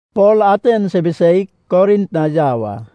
Pol Atens ibiseig Korint na yau a.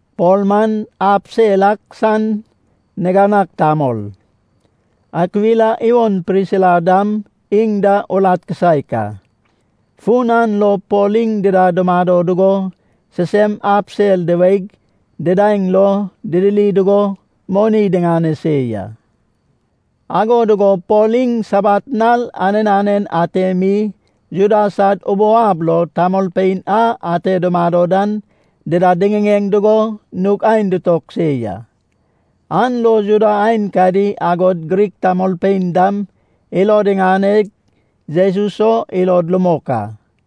Pol man ab sel ak san niganag tamol. Akwila iwon Prisila dam iŋ da urat kisaek a. Fun an lo Pol iŋ dida dumado dugo sisem ab sel diweig didaeŋ lo didiri dugo moni diŋane se ya. Ago dugo Pol iŋ Sabat nal anen anen ate mi Juda sad ubou ab lo tamolpein a ate dumado dan dida diŋiŋeŋ dugo nug aen ditog se ya. An lo Juda aenkadi agod Grik tamolpein dam ilod iŋaneg Jesus o ilod rumok a.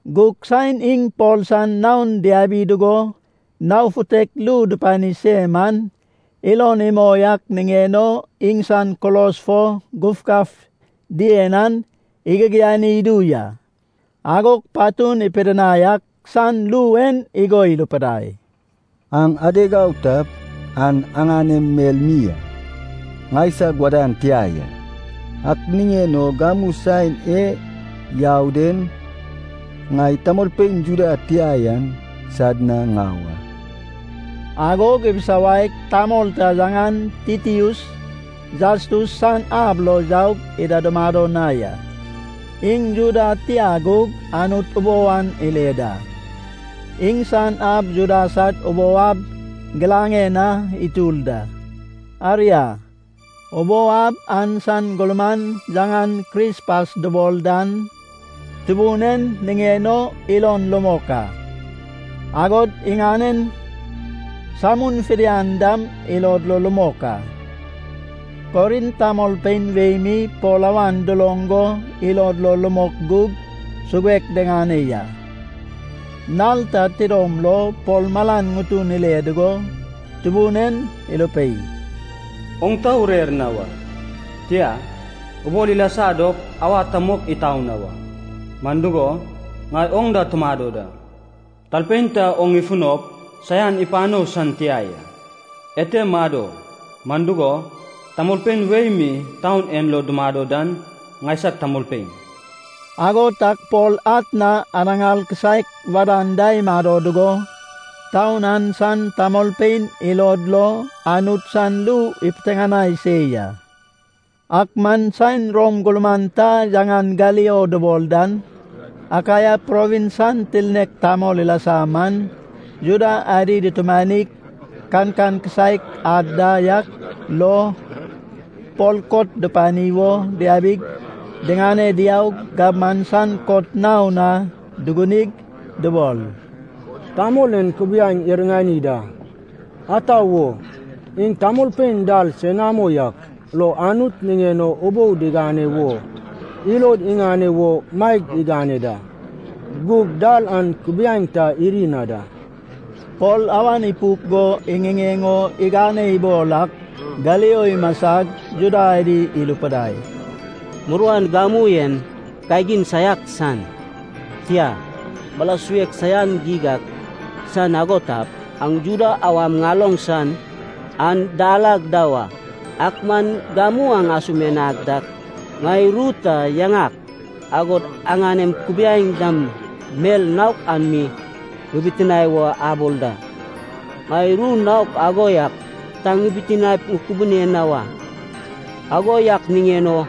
Gug saen iŋ Pol san naon diabi dugo nao futek ru dupani se man, ilon imoi ak niŋen o iŋsan kulos fo gufgaf dien an igigiani idu ya. Agog patun ipidinai ak san ru en igo irupidai, “Aŋ adeg au tap, an aŋanem mel mi a, ŋaisag wadan tia ya. Ak niŋen o gamu saen e yau den, ŋai tamolpein Juda tia yan sad na ŋau a.” Agog ibisawaig, tamol ta yaŋan Titius Jastus san ab lo yaug ida dumado na ya. Iŋ Juda tia gug Anut ubou an ile da. Iŋsan ab Juda sad ubou ab giraŋen na itur da. Aria, ubou ab an san gurman yaŋan Krispas dubol dan Tubun en niŋen o ilon rumok a, agod iŋanen samun fidian dam ilod lo rumok a. Korint tamolpein wei mi Pol awan duloŋ go ilod lo rumok gug suguek diŋane ya. Nal ta tidom lo Pol malan ŋutun ile dugo Tubun en irupei, “Oŋ ta urer na wa. Tia, ubol ilasa dop awa ta mok itau na wa. Man dugo, ŋai oŋ da tumado da. Talpein ta oŋ ifunop saian ipano san tia ya. Ete mado, man dugo, tamolpein wei mi taun en lo dumado dan ŋaisag tamolpein.” Ago tag Pol atna anaŋar kisaek wadan da imado dugo, taun an san tamolpein ilod lo Anut san ru ipiteŋanai se ya. Ak man saen Rom gurman ta yaŋan Galio dubol dan, Akaia provins san tirnek tamol ilasa man, Juda adi dutumanig kankan kisaek ad da yak lo, Pol kot dupani wo diabig, diŋane diaug gabman san kot naon na dugunig dubol, “Tamol en kubiaeŋ iriŋani da. Ata wo? Iŋ tamolpein dal senamo yak lo Anut niŋen o ubou digane wo ilod iŋane wo maeg igane da. Gug dal an kubiaeŋ ta iri na da.” Pol awan ipuk go iŋiŋeŋ o igane ibol ak Galio imasag Juda adi irupidai, “Muruan gamu en kagin saiak san, tia, mala suek saian geig ak san ago tap, aŋ Juda awam ŋaloŋ san an dal ag da wa. Ak man gamu aŋ asumianag dak, ŋai ru ta, yaŋak, agod aŋanem kubiaeŋ dam mel naok an mi ŋibitinae wo abol da. Ŋai ru naok ago yak ta ŋibitinaep ŋukubune na wa. Ago yak niŋen o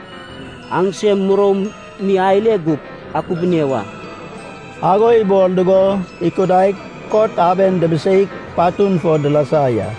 aŋsem muroum mi ale gup akubune wa.” Ago ibol dugo ikudaig kot aben dubiseig, patun fo dilasa ya.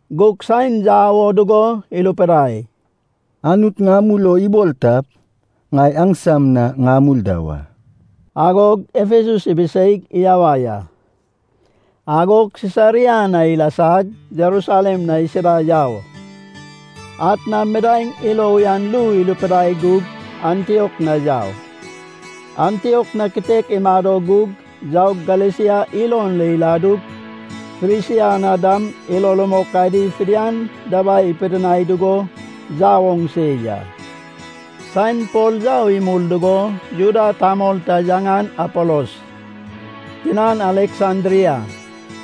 Gug saen yau o dugo irupidai, “Anut ŋamul o ibol tap, ŋai aŋsam na ŋamul da wa.” Agog Efesus ibiseig iyawai a. Agog Sisaria na ilasag, Jerusalem na isida yau. Atna midaeŋ ilo uyan ru irupidai gug Antiok na yau. Antiok na kitek imado gug yaug Galesia ilon lo iladug, Frisia na dam ilo rumok adi fidian dabai ipidinai dugo yau oŋ se ya. Saen Pol yau imul dugo Juda tamol ta yaŋan Apolos, tinan Aleksandria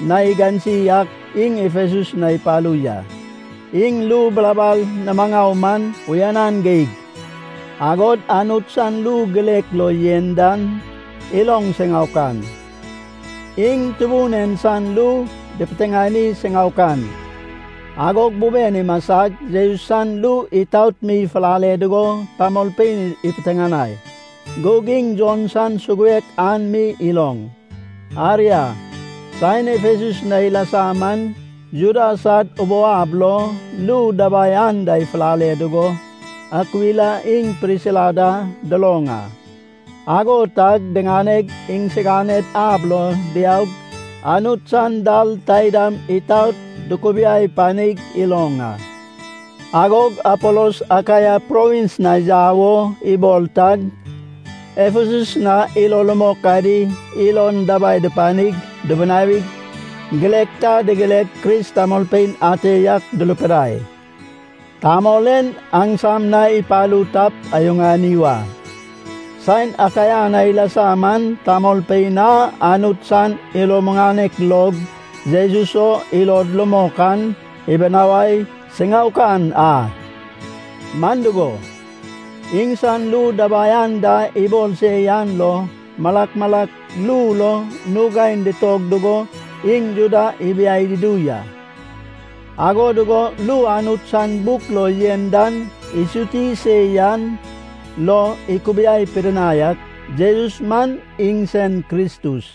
na igansi ak iŋ Efesus na ipalu ya. Iŋ ru bilabal nimaŋau man uyanan geig. Agod Anut san ru girek lo yen dan iloŋ siŋaokan. Iŋ Tubun en san ru dupiteŋani siŋaokan. Agog buben imasag, Jesus san ru itaot mi ifulale dugo tamolpein ipiteŋanai. Gug iŋ Jon san suguek an mi iloŋ. Aria, saen Efesus na ilasa man, Juda sad ubou ab lo ru dabai anda ifulale dugo Akwila iŋ Prisila da duloŋ a. Ago tag diŋaneg, iŋsiganed ab lo diaug, Anut san dal taidam itaot dukubiai panig iloŋ a. Agog Apolos Akaia provins na yau o ibol tag, Efesus na ilo rumok adi ilon dabai dupanig dubunawig, girek ta digireg Kris tamolpein ate yak durupidai, “Tamol en aŋsam na ipalu tap, ayuŋani wa.” Saen Akaia na ilasa man, tamolpein a Anut san ilo muŋanek log Jesus o ilod rumok an ibinawai siŋaokan a. Man dugo, iŋsan ru dabai anda ibol se yan lo malak malak ru lo nug aen ditog dugo iŋ Juda ibiai dudu ya. Ago dugo ru Anut san buk lo yen dan isuti se yan lo ikubiai pidinai ak, Jesus man iŋsen Kristus.